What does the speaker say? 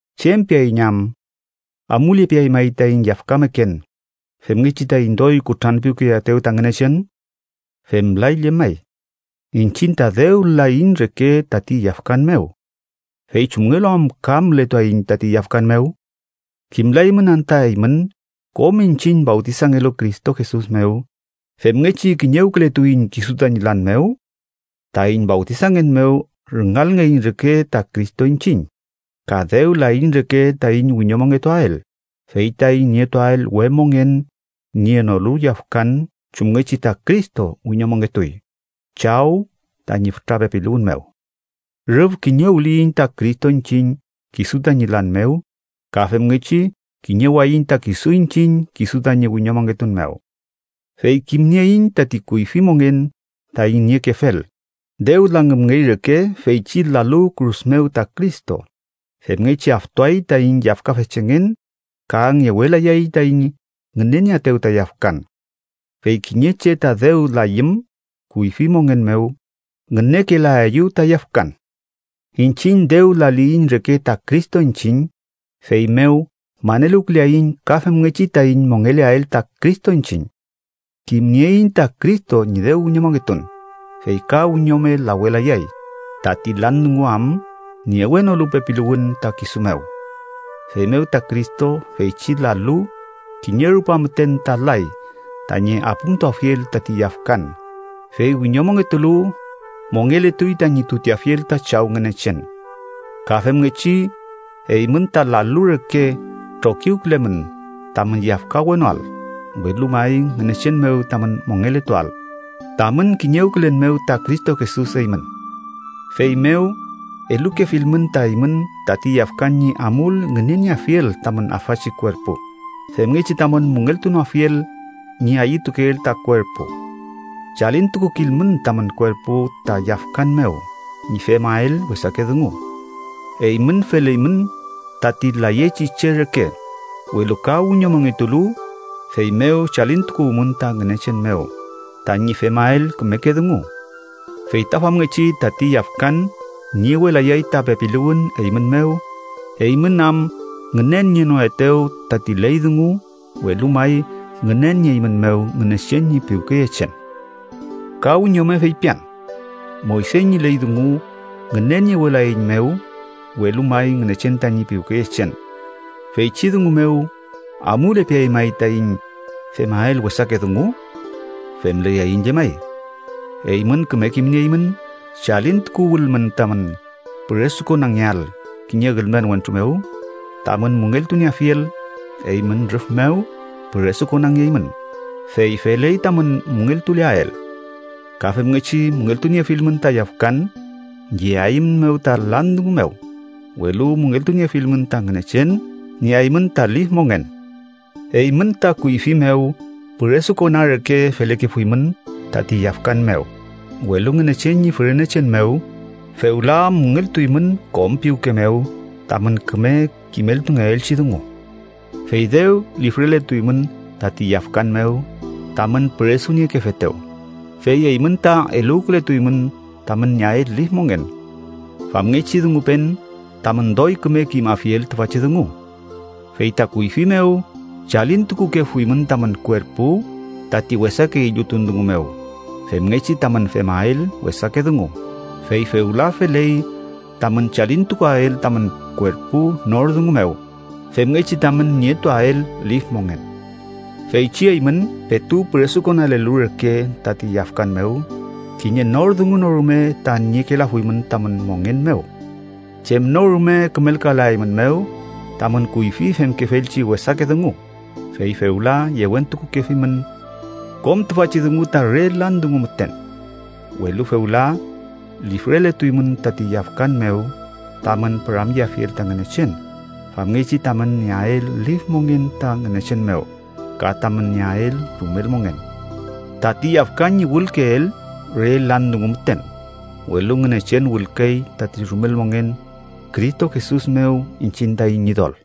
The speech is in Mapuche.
¿Chem piaiñ am? ¿Amulepeay may taiñ yafkameken femngechi taiñ doy kutranpiwkeyeaetew ta Ngünechen? ¡Femlay llemay! Iñchiñ ta dew laiñ reke tati yafkan mew, ¿fey chumngelu am ka mületuaiñ tati yafkan mew? ¿Kimlaymün anta eymün, kom iñchiñ fawtisangelu Cristo Jesus mew, femngechi kiñewkületuiñ kisu tañi lan mew? Taiñ fawtisangen mew rüngalngeiñ reke ta Cristo iñchiñ, ka dew laiñ reke taiñ wiñomongetuael, fey taiñ nietuael we mongen nienolu yafkan chumngechi ta Cristo wiñomongetuy Chaw tañi fütra pepiluwün mew. Rüf kiñewliyiñ ta Cristo iñchiñ kisu tañi lan mew, ka femngechi kiñewayiñ ta kisu iñchiñ kisu tañi wiñomongetun mew. Fey kimnieiñ tati kuyfi mongen taiñ niekefel, dew langümngey reke feychi lalu kürus mew ta Cristo, femngechi aftuay taiñ yafkafechengen ka ngewelayay taiñ ngünenieaetew ta yafkan. Fey kiñe che ta dew layüm kuyfi mongen mew, ngünekelaeyew ta yafkan. Iñchiñ dew laliyiñ reke ta Cristo iñchiñ, feymew maneluwküleaiñ ka femngechi taiñ mongeleael ta Cristo iñchiñ. Kimnieiñ ta Cristo ñi dew wiñomongetun, fey ka wiñome lawelayay, tati lan dungu am niewenolu pepiluwün ta kisu mew. Feymew ta Cristo, feychi lalu, kiñe rupa müten ta lay tañi apümtuafiel tati yafkan, fey wiñomongetulu, mongeletuy tañi tuteafiel ta Chaw Ngünechen. Ka femngechi, eymün ta lalu reke trokiwkülemün tamün yafkawenoael, welu may Ngünechen mew tamün mongeletuael, tamün kiñewkülen mew ta Cristo Jesus eymün. Feymew, elukefilmün ta eymün tati yafkan ñi amul ngünenieafiel tamün afachi kuerpu, femngechi tamün müngeltunoafiel ñi ayütukeel ta kuerpu. Chalintukukilmün tamün kuerpu ta yafkan mew ñi femael wesake dungu. Eymün feleymün tati layechi che reke, welu ka wiñomongetulu, feymew chalintukuwmün ta Ngünechen mew, tañi femael kümeke dungu. Fey ta famngechi tati yafkan niewelayay ta pepiluwün eymün mew, eymün am ngünenienoetew tati ley dungu, welu may ngünenieeymünmew Ngünechen ñi piwkeyechen. Ka wiñome feypian: Moyse ñi ley dungu ngüneniewelaeiñmew, welu may Ngünechen tañi piwkeyechen. Feychi dungu mew, ¿amulepeay may taiñ femael wesake dungu? ¡Femlayaiñ llemay! Eymün küme kimnieymün chalintukuwülmün tamün püresukonangeael kiñe ülmen wentru mew tamün müngeltunieafiel, eymün rüf mew püresukonangeymün, fey feley tamün müngeltuleael. Ka femngechi müngeltuniefilmün ta yafkan, yeaeymünmew ta lan dungu mew, welu müngeltuniefilmün ta Ngünechen nieaymün ta lif mongen. Eymün ta kuyfi mew püresukona reke felekefuymün tati yafkan mew, welu Ngünechen ñi fürenechen mew, fewla müngeltuymün kom piwke mew tamün küme kimeltungeelchi dungu. Fey dew lifreletuymün tati yafkan mew tamün püresuniekefetew, fey eymün ta eluwkületuymün tamün nieael lif mongen. Famngechi dungupen tamün doy küme kimafiel tüfachi dungu. Fey ta kuyfi mew chalintukukefuymün tamün kuerpu tati wesake illutun dungu mew, femngechi tamün femael wesake dungu, fey fewla feley tamün chalintukuael tamün kuerpu nor dungu mew, femngechi tamün nietuael lif mongen. Feychi eymün petu püresukonalelu reke tati yafkan mew, kiñe nor dungu no rume ta niekelafuymün tamün mongen mew. Chem no rume kümelkalaeymünmew tamün kuyfi femkefelchi wesake dungu, fey fewla yewentukukefimün. Kom tüfachi dungu ta re lan dungu müten. Welu fewla lifreletuymün tati yafkan mew tamün püramyeafiel ta Ngünechen, famngechi tamün nieael lif mongen ta Ngünechen mew, ka tamün nieael rumel mongen. Tati yafkan ñi wülkeel re lan dungu müten, welu Ngünechen wülkey tati rumel mongen, Cristo Jesus mew, iñchiñ taiñ Ñidol.